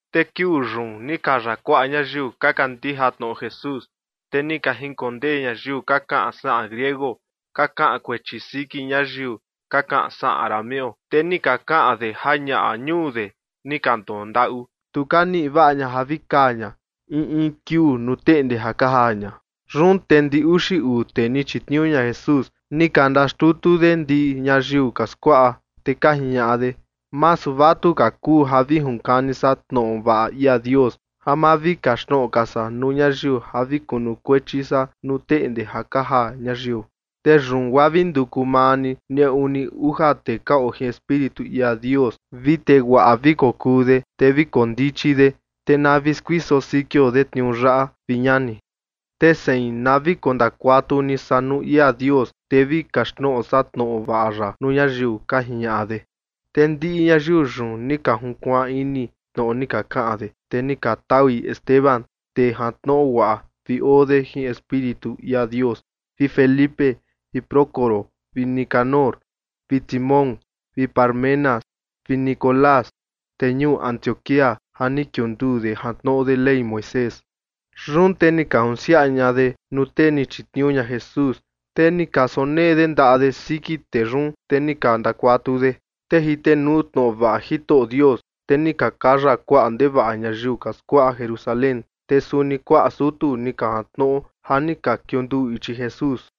Te kiuu yun ni kaya kuaꞌa ñayiu ka kandija tnoꞌo Jesús. Te ni ka jinkondee ñayiu ka kaꞌan saꞌan griego ka kaꞌan kuechi siki ñayiu ka kaꞌan saꞌan arameo. Te ni ka kaꞌan de ja ñaꞌa ñuu de ni ka ndondaꞌu, tu ka niꞌi vaꞌa ña ja vi kaa ña in in kiuu nuu teꞌnde ja ka jaa ña. Yun te ndi uxi uu tee ni chitniuu ña Jesús ni ka ndaxtutu de ndiꞌi ñayiu ka skuaꞌa, te ka jiñaꞌa de: ―Masu vatuka kuu ja vi junkani san tnoꞌo vaꞌa ia Dios, ja ma vi kaxtnoꞌo ka san nuu ñayiu ja vi kunukuechi san nuu teꞌnde ja ka jaa ñayiu. Te yun guaa vi nduku maa ni neꞌu ni uja tee ka oo jin Espíritu ia Dios, vi tee guaꞌa vi kokuu de, te vi koo ndichi de, te na vi skuiso sikio de tniuu yaꞌa, vi ñani. Te sein, na vi kondakuatu ni san nuu ia Dios, te vi kaxtnoꞌo san tnoꞌo vaꞌa ya nuu ñayiu ―ka jiñaꞌa de. Te ndiꞌi ñayiu yun ni ka junkuaan ini tnoꞌo ni ka kaꞌan de, te ni ka taui Esteban, tee jantnoꞌo guaꞌa vi oo de jin Espíritu ia Dios, vi Felipe vi Prócoro vi Nicanor vi Timón vi Parmenas vi Nicolás, tee ñuu Antioquía ja ni kiunduu de jantnoꞌo de Ley Moisés. Yun te ni ka junsiaꞌa ña de nuu tee ni chitniuu ña Jesús, te ni ka sonee de ndaꞌa de siki tee yun, te ni ka ndakuatu de. Te jitenuu tnoꞌo vaꞌa Jitoꞌo Dios, te ni ka kaya kuaꞌa ndevaꞌa ñayiu ka skuaꞌa Jerusalén, te suni kuaꞌa sutu ni ka jantnoꞌo ja ni ka kiunduu ichi Jesús.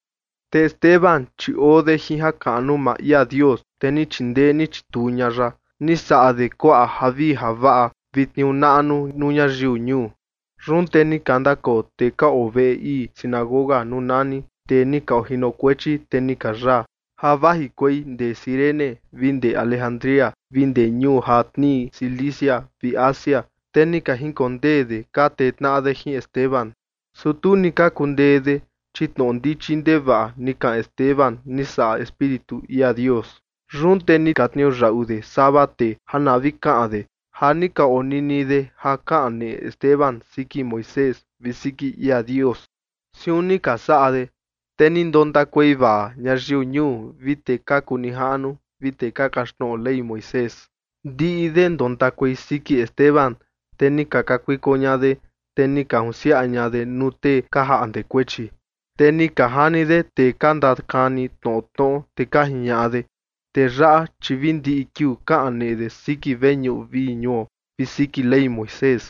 Te Esteban, chi oo de jin jakaꞌnu maa ia Dios, te ni chindee ni chituu ña ya. Ni saꞌa de kuaꞌa javii javaꞌa vi tniuu naꞌnu nuu ñayiu ñuu. Yun te ni ka ndakoo tee ka oo veꞌe ii sinagoga nuu nani “tee ni ka ojinokuechi te ni ka yaa” ja vajikuei ndee Cirene vi ndee Alejandría vi ndee ñuu ja tnii Cilicia vi Asia, te ni ka jinkondee de ka tee tnaꞌa de jin Esteban. Su tu ni ka kundee de, chi tnoꞌo ndichi ndevaꞌa ni kaꞌan Esteban, ni saꞌa Espíritu ia Dios. Yun te ni ka tniuyaꞌu de sava tee ja na vi kaꞌan de ja ni ka onini de ja kaneꞌe Esteban siki Moisés vi siki ia Dios. Siun ni ka saꞌa de, te ni ndontakuei vaa ñayiu ñuu vi tee ka kuu nijaꞌnu vi tee ka kaxtnoꞌo Ley Moisés. Ndiꞌi de ndontakuei siki Esteban, te ni ka kakuiko ña de, te ni ka junsiaꞌa ña de nuu tee ka jaꞌnde kuechi. Te ni ka jani de tee ka ndakani tnoꞌo tnoꞌo, te ka jiñaꞌa de: ―Tee yaꞌa, chi vi ndiꞌi kiuu kaneꞌe de siki veñuꞌu vii ñuo vi siki Ley Moisés.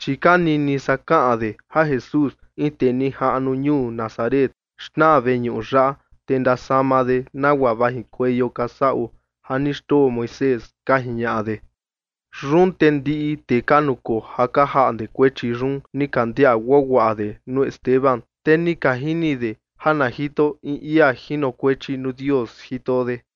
Chi ka nini san kaꞌan de ja Jesús, in tee nijaꞌnu ñuu Nazaret, xnaa veñuꞌu yaꞌa, te ndasama de nagua vajikueio ka saꞌo ja ni xndoo Moisés ―ka jiñaꞌa de. Yun te ndiꞌi tee ka nukoo ja ka jaꞌnde kuechi yun ni ka ndiaꞌa guaguaꞌa de nuu Esteban, te ni ka jini de ja na jito in ia jinokuechi nuu Dios jito de.